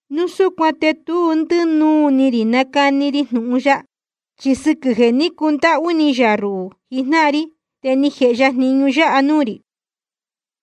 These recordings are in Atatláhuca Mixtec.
Núu súcuan te tu ndínuu ni rī cánacani ri jnūhun ya. Chi sɨquɨ̄ jeē ní cundáhú ni yā ruhū jijnáhan ri te ni jēhe ya jniñu yáha nuū rī.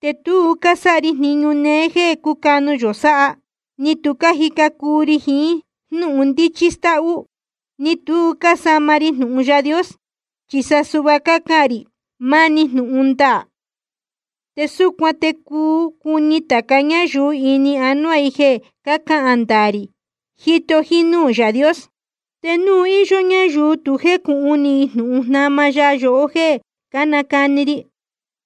Te tu cásáha ri jniñu néé jéē cúcanu yō sáha, ni tu cájica cuu ri jiín jnúhun ndíchí stáhú, ni tu cásama ri jnūhun Yaā Dios. Chi sa suhva cácahān rī máni jnūhun ndaā. Te súcuan te cuu cuni tāca ñáyuu ini anuá i jeē cácahān ndaā rī jíto jínúū Yaā Dios. Te núu íyó ñáyuu tu jécūhun ni jnūhun jnama ya yohó jéē cánacani ri,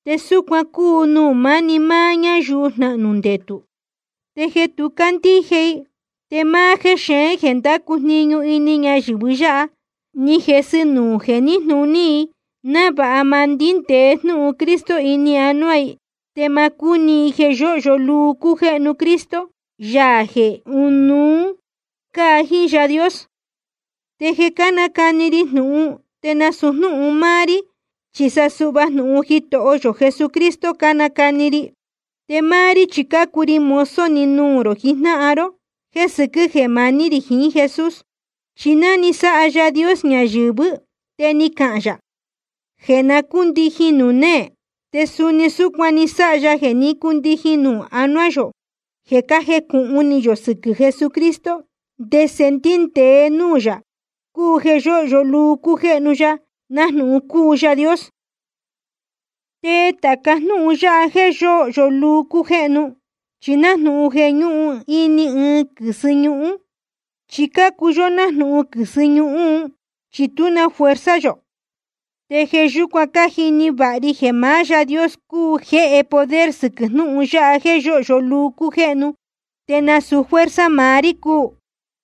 te súcuan cúu nuū máni máá ñáyuu jnahnū ndetū. Te jeē tu cácandíje i, te máá jéxeén jeē ndácu jniñu ini ñayɨ̄vɨ yáha, ní jesɨ nuū jeē níjnūní i, návāha ma ndíndēe jnúhun Cristo ini anuá i, te ma cúni i jeē yóhyo luu cújéhnu Cristo, Yaā jeē ɨ́nuú cáa jiín Yaā Dios. Te jeē cánacani ri jnūhun, te nasūu jnúhun máá rí, chi sa suhva jnūhun Jitoho yō Jesucristo cánacani ri. Te máá rí chi cácuu ri mozo‑ni nuū rō jijnáhan ró jéē sɨquɨ́ jeē maní rī jiín Jesús. Chi ná ni sáha Yaā Dios ñayɨ̄vɨ́ te ni cahān yā jeē na cúndijin nuū néē. Te suni súcuan ni sáha ya jeē ní cundijin nuū anuá yō jeē cájecūhun ni yō sɨquɨ̄ Jesucristo, ndese ndíndēe núū yā, cúu jeē yōhyo luu cújéhnu ya nájnūhun cúu Yaā Dios. Te tāca jnúhun yáha jeē yóhyo luu cújéhnu, chi nájnūhun jeē ñúhun ini ɨɨn quɨ̄sɨ ñuhun. Chi cácuu yó nájnūhun quɨ̄sɨ ñuhun, chi tú na fuerza yō. Te jeē yúcuan cájini vāha ri jeē maá Yaā Dios cúu jeē jéhe poder sɨquɨ̄ jnúhun yáha jeē yóhyo luu cújéhnu, te nasūu fuerza maá rí cúu.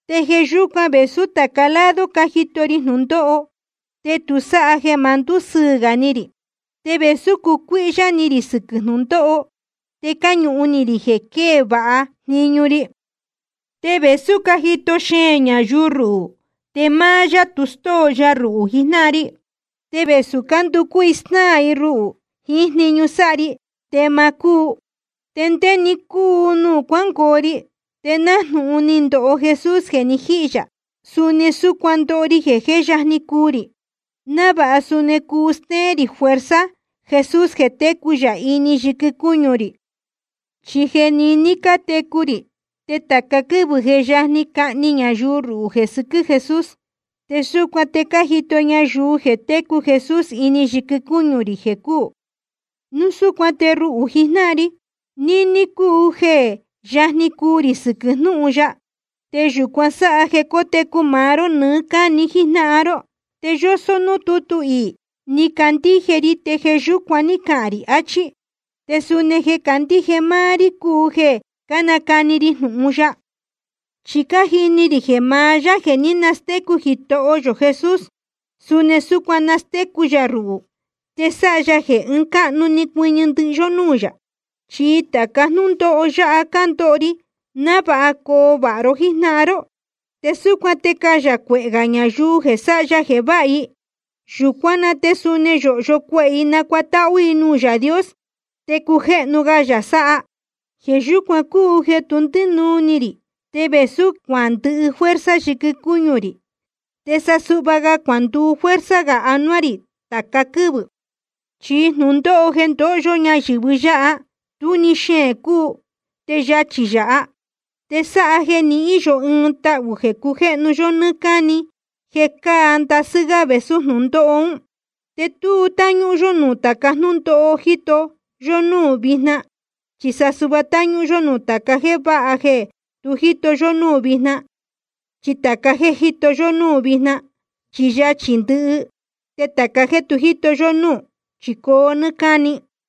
Te jeē yúcuan, vēsú tāca lado cájito ri jnūndóho, te tu sáha jeē ma ndúsɨɨ̄ gā ni rī. Te vēsú cácucuíhyá ni rī sɨquɨ̄ jnūndóho, te cáñuhun ni rī jeē quee vāha jniñu ri. Te vēsú cájito xeēn ñayuu ruhū, te máá yá tu stóo ya ruhū jijnáhan ri. Te vēsú cánducú i snáā i ruhū jiín jniñu sáha ri, te ma cúu. Te ndé-ni cúu nuū cuángoo ri, te nájnūhun ni ndoho Jesús jeē ni jíhī yā, suni súcuan cándoho ri jeē jé yajni cuu rī, návāha suni cuu stéén rī fuerza Jesús jeē técu yā ini yɨquɨ cúñu rī. Chi jeē niní cátecu rī, te tāca quɨ́vɨ̄ je yajni cahni ñayuu ruhū jeē sɨquɨ́ Jesús. Te súcuan te cájito ñayuu jeē técu Jesús ini yɨquɨ cúñu rī jeē cúū. Núu súcuan te ruhū jijnáhan ri, níní cúu jeē jé yajni cuu rī sɨquɨ̄ jnúhun ya, te yūcuan sáha jeē cotecu maá ró nɨɨ́ cáni jijnáhan ró. Te yósó núū tútu iī: Ni candíje ri te jeē yúcuan ní cahān rī, achí. Te suni jeē cácandíje máá rí cúu jeē cánacani ri jnūhun ya. Chi cájini rī jeē maá Yaā jeē ní nastécu Jitoho yō Jesús, suni súcuan nastécu yā ruhū, te sáha ya jeē ɨɨn cáhnu ni cuɨñɨ ndɨhɨ yó núū yā. Chi tāca jnúndóho yáha cándoho ri návāha coo vāha ró jíjnáhan ró. Te súcuan te cayā cuehē gā ñayuu jeē sáha ya jeē váha i. Yūcuán na te suni yōhyo cuehē i nacuatáhú i nuū Yaā Dios, te cujéhnu ga yā sáha. Jeē yúcuan cúu jeē tu ndínuu ni rī, te vēsú cuandɨhɨ fuerza yɨquɨ cúñu rī, te sa suhva cuanduu fuerza gā anuá rī tāca quɨ́vɨ̄. Chi jnūndóho jeē ndóho yó ñayɨ̄vɨ yáha, tú‑ni xeēn cúu, te yachī yāha. Te sáha jeē nihín yō ɨɨn tahū jeē cujéhnu yó nɨ́ɨ́ cáni jeē cáa ndasɨ́ gá vēsú jnūndóho ún. Te tu táñúhún yó nuū tāca jnúndóho jíto yó núū vijna, chi sa suhva táñúhún yó nuū tāca jéē váha jeē tu jíto yó núū vijna. Chi tāca jéē jíto yó núū vijna, chi yachī ndɨhɨ, te tāca jéē tu jíto yó núū, chi coo nɨ́ɨ́ cáni.